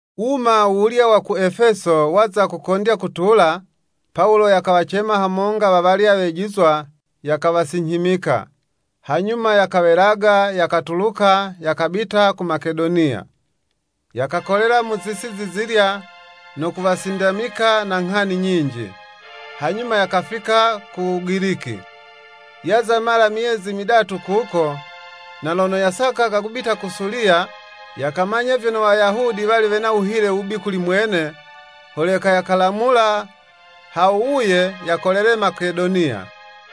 Wuma wuwulya wa ku Efeso waza kukondya kutula, Pawulo yakawacema hamonga wawalya wejizwa, yakawasinyhimika. Hanyuma yakawelaga, yakatuluka, yakabita ku Makedoniya. Yakakolela mu zisi zizilya, no kuwasindamika na nghani nyinji. Hanyuma yakafika ku Wugiliki. Yaza mala myezi midatu kuko, na lono yasakaga kubita ku Suliya, yakamanya vyono Wayahudi wali wena wuhile wubi kuli mwene, holeka yakalamula ha wuwuye, yakolele Makedoniya.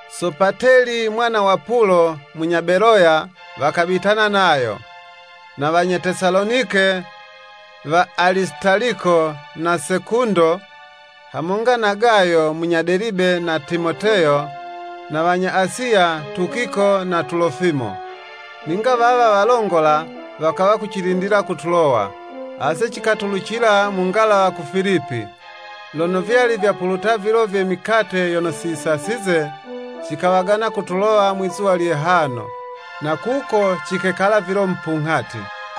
Sopateli mwana wa Pulo munya Beloya wakabitana nayo, na wanya Tesalonike, wa Alisitaliko na Sekundo, hamonga na Gayo munya Delibe na Timoteyo, na wanya Asiya, Tukiko na Telofimo. Ninga wawa walongola, wakawa kucilindila ku Tulowa. Ase cikatulucila mu ngalawa ku Filipi, lono vyali vyapuluta vilo vye mikate yono si yisasize, cikawagana ku Tulowa mwizuwa lye hano, na kuko cikekala vilo mupunghati.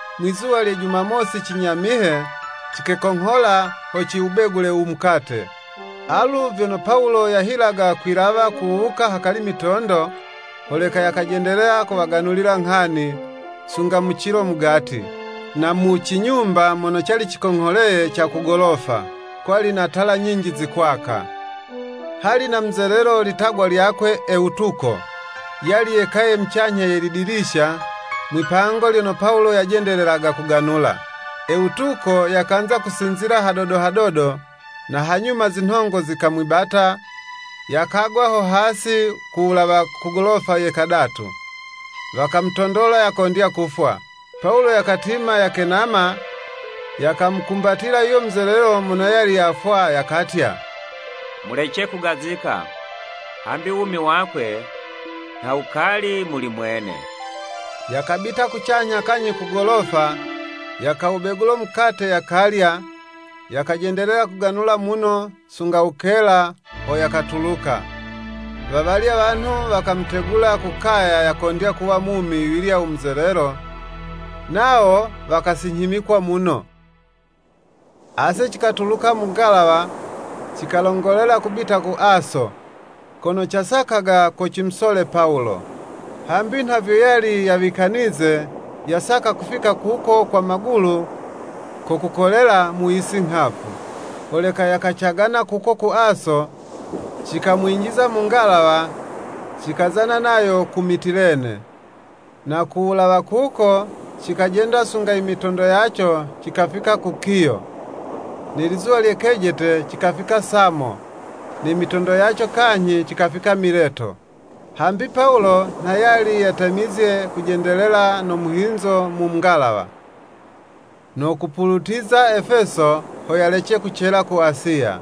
Mwi'zuwa lye jumamosi cinyamihe, cikekonghola ho ciwubegule umukate. Alu vyono Pawulo yahilaga kwilawa kuwuka hakali mitondo, holeka yakajendelela kuwaganulila nghani, sunga mu cilo mugati. Na mu cinyumba mono cali cikongholeye ca ku golofa, kwali na tala nyinji zikwaka. Hali na muzelelo litagwa lyakwe Ewutuko, yali yekaye mucanyha ye lidilisha, mwipango lyono Pawulo yajendelelaga kuganula. Ewutuko yakanza kusinzila hadodo hadodo, na hanyuma zinhongo zikamwibata, yakagwa ho hasi ku wulawa ku golofa ye kadatu. Wakamutondola yakondya kufwa. Pawulo yakatima, yakenama, yakamukumbatila yuyo muzelelo mono yali yafwa, yakatya, “Mulece kugazika, hambi wumi wakwe nha wukali muli mwene.” Yakabita kucanyha kanyhi kugolofa, yakawubegula mukate, yakalya, yakajendelela kuganula muno, sunga wukela, ho yakatuluka. Wawalya wanhu wakamutegula ku kaya yakondya kuwa mumi yuyulya u muzelelo, nawo wakasinyhimikwa muno. Ase cikatulucila mu ngalawa, cikalongolela kubita ku Aso, kono casakaga ko cimusole Pawulo. Hambi nha vyo yali yawikanize, yasaka kufika kuko kwa magulu ko kukolela mu yisi nghavu. Holeka yakacagana kuko ku Aso, cikamwinjiza mu ngalawa, cikazana nayo ku Mitilene. Na ku wulawa kuko, cikajenda sunga imitondo yaco cikafika ku Kiyo. Ne lizuwa lye kejete cikafika Samo, ne mitondo yaco kanyhi cikafika Mileto. Hambi Pawulo nha yali yatemizye kujendelela no muhinzo mu ngalawa, no kupulutiza Efeso, ho yalece kucela ku Asiya.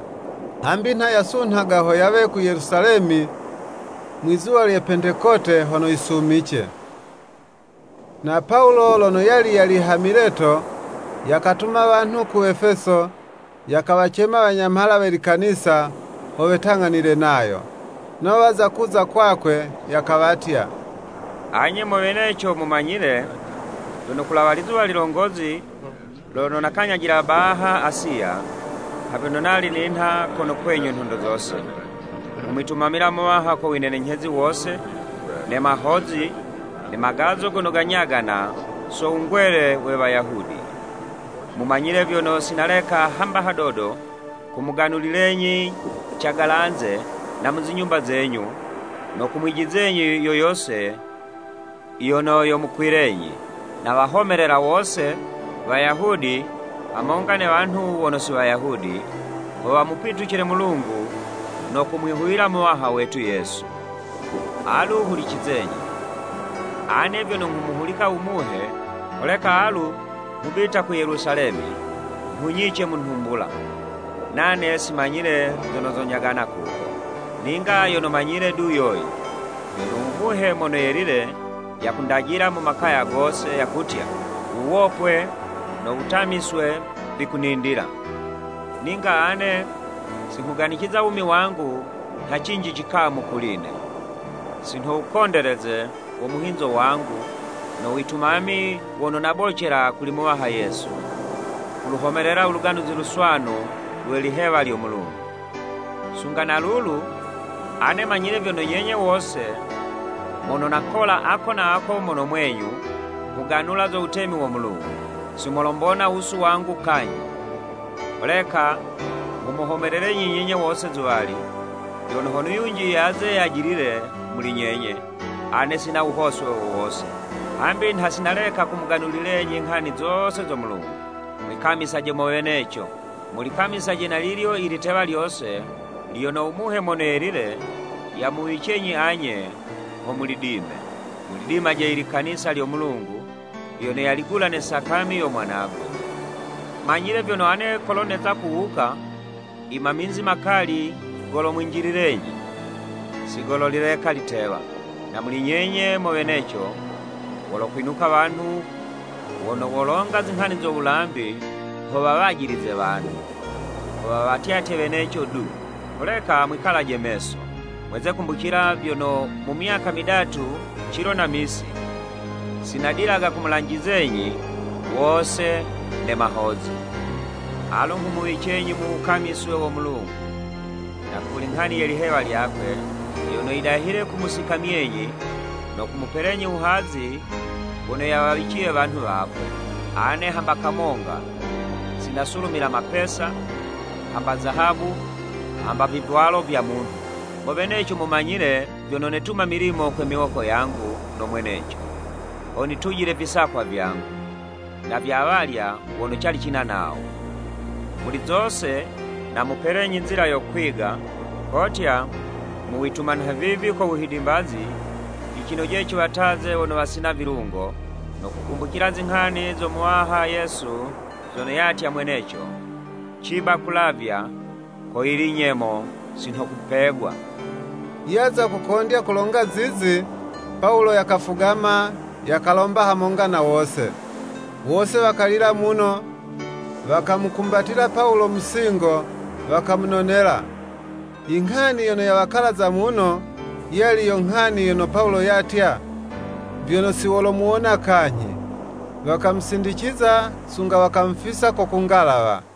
Hambi nha yasunhaga ho yawe ku Yelusalemi mwizuwa lye Pentekote hono yisumice. Na Pawulo lono yali yali ha Mileto, yakatuma wanhu ku Efeso, yakawacema wanyamhala we Likanisa, ho wetang'anile nayo. Nawo waza kuza kwakwe, yakawatya, “Anye mo weneco mumanyile, vyono kulawa lizuwa lilongozi lono nakanyajila baha Asiya, nha vyono nali ninha kono kwenyu nhondo zose, nghumwitumamila Muwaha ko winenenyhezi wose, ne mahozi, ne magazo gono ganyagana so wungwele we Wayahudi, mumanyile vyono sinaleka hamba hadodo kumuganulilenyi cagalanze na mu zinyumba zenyu, no kumwijizenyi yo yose yono yomukwilenyi. Nawahomelela wose, Wayahudi hamonga ne wanhu wono si Wayahudi, ho wamupitucile Mulungu no kumwihuwila Muwaha wetu Yesu. Alu hulicizenyi! Ane vyono nghumuhulika u Muhe, holeka alu nghubita ku Yelusalemi, nhunyice mu nhumbula, nane si manyile zono zonyagana kuko. Ninga yono manyile du yoyi, vyono u Muhe Mono Yelile yakundajila mu makaya gose, yakutya, wuwopwe no wutamiswe vikunindila. Ninga ane si nghuganiciza wumi wangu nha cinji cikamu kuli'ne, si nho wukondeleze wo muhinzo wangu, no witumami wono nabocela kuli Muwaha Yesu, kuluhomelela u Luganuzi Luswanu lwe lihewa lyo Mulungu. “Sunga na lulu, ane manyile vyono nyenye wose, mono nakola ako na ako mono mwenyu, nghuganula zo wutemi wo Mulungu. Si molombona wusu wangu kanyhi. Holeka nghumuhomelelenyi nyenye wose zuwali, vyono hono yunji yaze yajilile muli nyenye, ane sina wuhoswe wo wose. Hambi nha sinaleka kumuganulilenyi nghani zose zo Mulungu. Mwikamisaje mo weneco, mulikamisaje na lilyo i litewa lyose, lyono u Muhe Mono Yelile yamuwicenyi anye ho mulidime. Mulidimaje ilikanisa lyo Mulungu, lyono yaligula ne sakami yo Mwanagwe. Manyile vyono ane kolo neza kuwuka, imaminzi makali golomwinjililenyi, si gololileka litewa. Na muli nyenye mo weneco, wolokwinuka wanhu wono wolonga zinghani zo wulambi ho wawajilize wanhu, ho wawatyatye weneco du. Holeka mwikalaje meso, mweze kumbucila vyono, mu myaka midatu cilo na misi, si nadilaga kumulanjizenyi wose ne mahozi. “Alu nghumuwicenyi mu wukamiswe wo Mulungu, na kuli nghani ye lihewa lyakwe, yono yidahile kumusikamyenyi, no kumupelenyi wuhazi wono yawawiciye wanhu wakwe. Ane hamba kamonga, si nasulumila mapesa, hamba zahabu, hamba vivwalo vya munhu. Mo weneco mumanyile, vyono netuma milimo kwe miwoko yangu no mweneco, ho nitujile visakwa vyangu, na vya awalya wono cali cina nawo. Muli zose, namupelenyi nzila yo kwiga, kotya, mu wituma nhavivi ko wuhidimbazi, yicinojele ciwataze wono wasina vilungo, no kukumbucila, zinghani zo Muwaha Yesu zono yatya mweneco, ‘Ciba kulavya, ko yili nyemo, si nho kupegwa.'" Yaza kokondya kulonga zizi, Pawulo yakafugama, yakalomba hamonga na wose. Wose wakalila muno, wakamukumbatila Pawulo mu singo, wakamunonela. I nghani yono yawakalaza muno, yali yo nghani yono Pawulo yatya, vyono, siwolomuwona kanyhi. Wakamusindiciza sunga wakamufisa ko ku ngalawa.